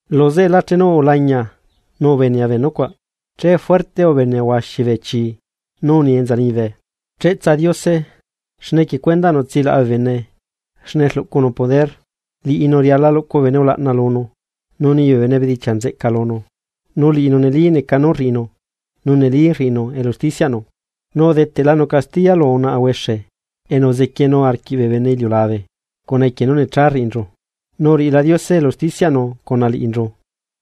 Luzeꞌela chenu ulañia nu ubenea bee nucuaꞌ, che fuerte ubenea huaxi bee chi nú uni enza liñibe: ¡Cheꞌtsa Diose! Xne equie cuendaꞌnu tsilaꞌa bee bene xne rluꞌcunu poder. Liꞌinu riala luꞌcu bee bene ulaꞌna lunu nu nii bee bene bedichiaꞌ nzeꞌca lunu. Nu liꞌinu neli neca nú rriꞌinu nu neli rriꞌinu elu usticiaꞌnu, nu udeteꞌlanu castiya lu unaꞌa huexe enu uzequienu arquiꞌ bee bene iliulabe cuna equie nú necha rriꞌinchu, nu uriꞌila Diose elu usticiaꞌnu cuna liꞌinchu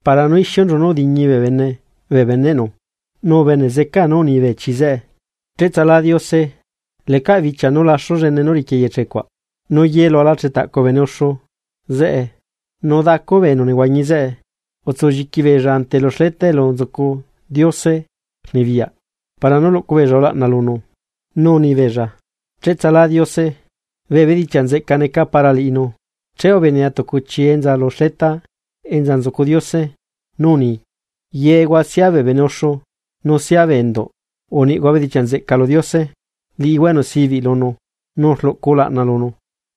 para nú ixiunchu nú udiñi bee bene bee beneꞌnu. Nu ubene zecaa nú uni bee chi zeꞌe: ―¡Cheꞌtsala Diose! Lecaꞌ bichia nú laxu llene nú riqui eyeche cuaꞌ. Nu ye lu alachetaꞌcu bee bene uxu zeꞌe nu dacu bee enu nehuañi zeꞌe, utsulliqui beella ante lu xleta elu nzucu Diose rnibiyaꞌ para nú luꞌcu beella ulaꞌna lunu, nu unibeella: ―¡Cheꞌtsalá Diose! ¡Bee bedichiaꞌ nzeꞌca neca para liꞌinu! Che ubenea tucu chi enza lu xleta enza nzucu Diose nú uni: Yehua sia bee bene uxu nu sia bee enduꞌ uniꞌhua bedichiaꞌ nzeꞌca lu Diose, liꞌihua enu sibiꞌ lunu, nu rluꞌcu ulaꞌna lunu.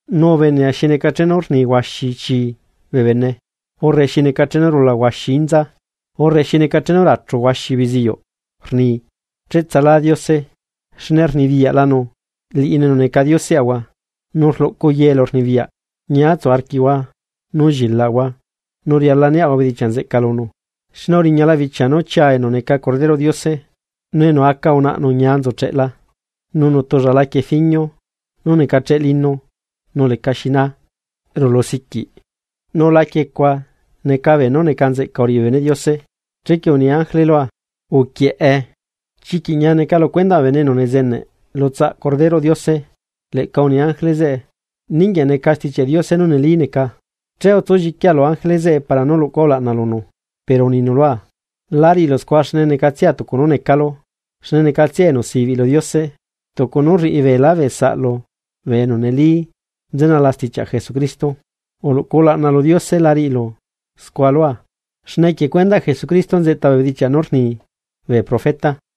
Nu ubenea xi neca chenu rni huaxi chi bee bene, urre xi neca chenu rula huaxi inza, urre xi neca chenu rachu huaxi beziyuꞌ, rni: ¡Cheꞌtsalá Diose! Xne rnibiyaꞌlanu Liꞌinu enu neca Dioseꞌahua, nu rluꞌcu ye elurnibiyaꞌ. Ñiatsu arquiaꞌahua, nu llilaꞌahua nu riala niaꞌahua bedichiaꞌ nzeꞌca lunu, xne uriñala bichia nú chia enu neca Corderoꞌ Diose. Nu enu aca unaꞌnu ñia nzucheꞌla. Nu nutulla laquie fiñio nú necacheꞌ lino nú lecaxi naa nu rulusiquiꞌ. Nu laquie cuaꞌ neca beenú neca nzeꞌca uriꞌi bee beneꞌ Diose. Chequie uni ángele lua: ―Uquieꞌe: “Chiquiꞌ ñia neca lu cuendaꞌ bee bene enu nezeneꞌ lu tsaꞌa Corderoꞌ Diose.” Leꞌca uni ángele zeꞌe lua: ―Ninguieꞌ neca Stichiaꞌ Diose nú neli neca. Che utsulliquia lu ángele zeꞌe para nú luꞌcua ulaꞌna lunu, pero uninu lua: ―La riꞌilu scua xne necatsia tucu nú necalu, xne necatsia enu sibiꞌ lu Diose, tucu nú rriꞌi beelá bee saꞌlu bee enu neli nzenala stichiaꞌ Jesucristo. Uluꞌcu ulaꞌna lu Diose la riꞌilu scua lua. Xne equie cuendaꞌ Jesucristo nzeꞌta bee bedichiaꞌ nú rni bee profeta.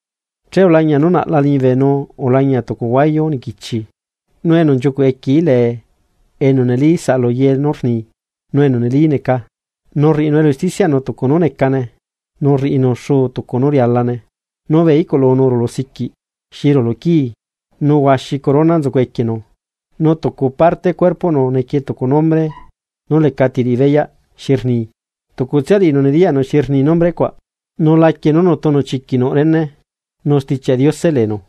Che ulañia nú naꞌla liñibe nu ulañia tucu huayu niquichi, nu enu nchiucuꞌ equieí lee enu neli saꞌalu ye nú rni, nu enu neli neca, nu rriꞌinu elu usticiaꞌnu tucu nú necane, nu rriꞌinu xuu tucu nú rialane. Nu bee iꞌculunu rulusiquiꞌ xi rulu quii, nu huaxi corona nzucu equienu, nu tucu parte cuerpoꞌnu nequie tucu nombre nú lecati riꞌi beyaꞌ xi rni, tucutsia liꞌinu nediyaꞌnu xi rni nombre cuaꞌ. Nu laquie nú nutunu chiquiꞌ nuꞌ rene, nu Stichiaꞌ Diose leenu.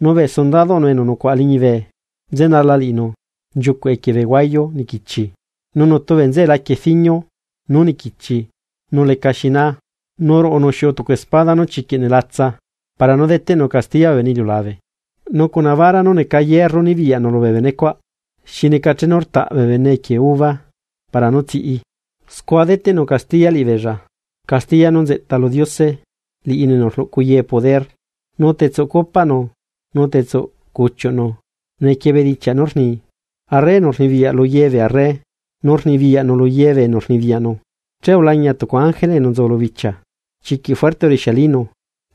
Nu bee sundadoꞌnu enu nucuaꞌa liñibe nzenala liꞌinu nchiucuꞌ equie bee huayu niquichi, nu nutu bee nzeꞌe laquie fiñio nú niquichi nu leca xinaa. Nu ruꞌunu xiuꞌu tucu espada nú chiquiꞌ nelatsa, para nú deteꞌnu castiya bee bene iliulabe, nu cuna bara nú neca hierro nibiyaꞌnu lubee benecuaꞌ. Xi neca chenu rtaꞌ bee bene equie uva para nú tsiꞌi, scua deteꞌnu castiya liꞌibeella, castiya nú nzeꞌta lu Diose, liꞌinu enu rluꞌcu ye poder. Nu tetsuꞌ copaꞌnu nu tetsuꞌ cuchiuꞌnu nequie bedichiaꞌ nú rni: “Arre enu rnibiyaꞌ luye bee arre, nu rnibiyaꞌnu luye bee enu rnibiyaꞌnu.” Che ulañia tucu ángele enu nzu lu bichia, chiquiꞌ fuerte urixialinu,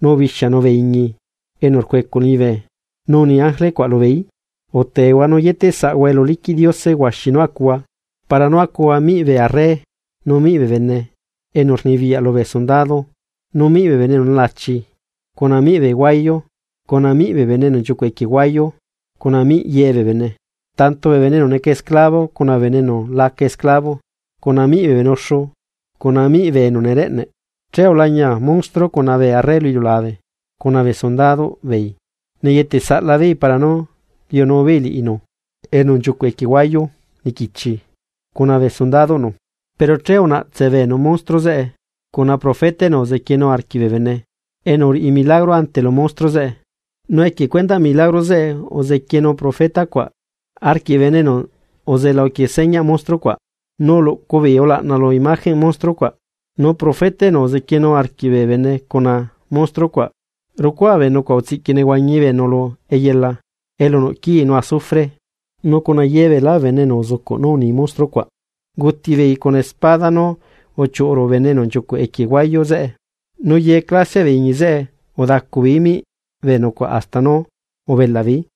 nu ubixianu bee iñi enu rcuecuꞌ liñibe, nu uni ángele cuaꞌ lubeeí: ―Utehua nu uyetesaꞌhua elu liquiꞌ Diose huaxi nú acuhua, para nú acuhua miꞌ bee arre nu miꞌ bee bene enu rnibiyaꞌ lubee sundado nu miꞌ bee bene enu nelachi, cuna miꞌ bee huayu, cuna miꞌ bee bene enu nchiucuꞌ equie bee huayu, cuna miꞌ ye bee bene, tanto bee bene enu neca esclavo cuna bee bene enu la aca esclavo, cuna miꞌ bee bene uxu cuna miꞌ bee bene enu nereꞌneꞌ. Che ulañia monstruo cuna bee arre lu iliulabe cuna bee sundadoꞌ beei neyeteꞌsaꞌla beei para nú liunubeei liꞌinu enu nchiucuꞌ equie huayu niquichi cuna bee sundadoꞌnu. Pero che unaꞌtse beenu monstruo zeꞌe cuna profeta enu uzequienu arquiꞌ bee bene, enu uriꞌi milagro ante lu monstruo zeꞌe. Nu equie cuendaꞌ milagro zeꞌe uzequienu profeta cuaꞌ arquiꞌ bee bene enu uzela uquie señaꞌ monstruo cuaꞌ, nu uluꞌcu beei ulaꞌna lu imagenꞌ monstruo cuaꞌ. Nu profeta enu uzequienu arquiꞌ bee bene cuna monstruo cuaꞌ rucuaa bee nucuaꞌ utsiꞌqui nehuañi beenu lu eyela elu nuꞌ quii nu azufre. Nu cuna ye beelá bee bene enu uzucuꞌ nú uni monstruo cuaꞌ, unguti beei cuna espada nú uchiuꞌu ruꞌu bene enu nchiucuꞌ equie huayu zeꞌe, nu ye clasiaꞌ bee iñi zeꞌe udacubeeí miꞌ bee nucuaꞌ hasta nú ubelaꞌbeeí.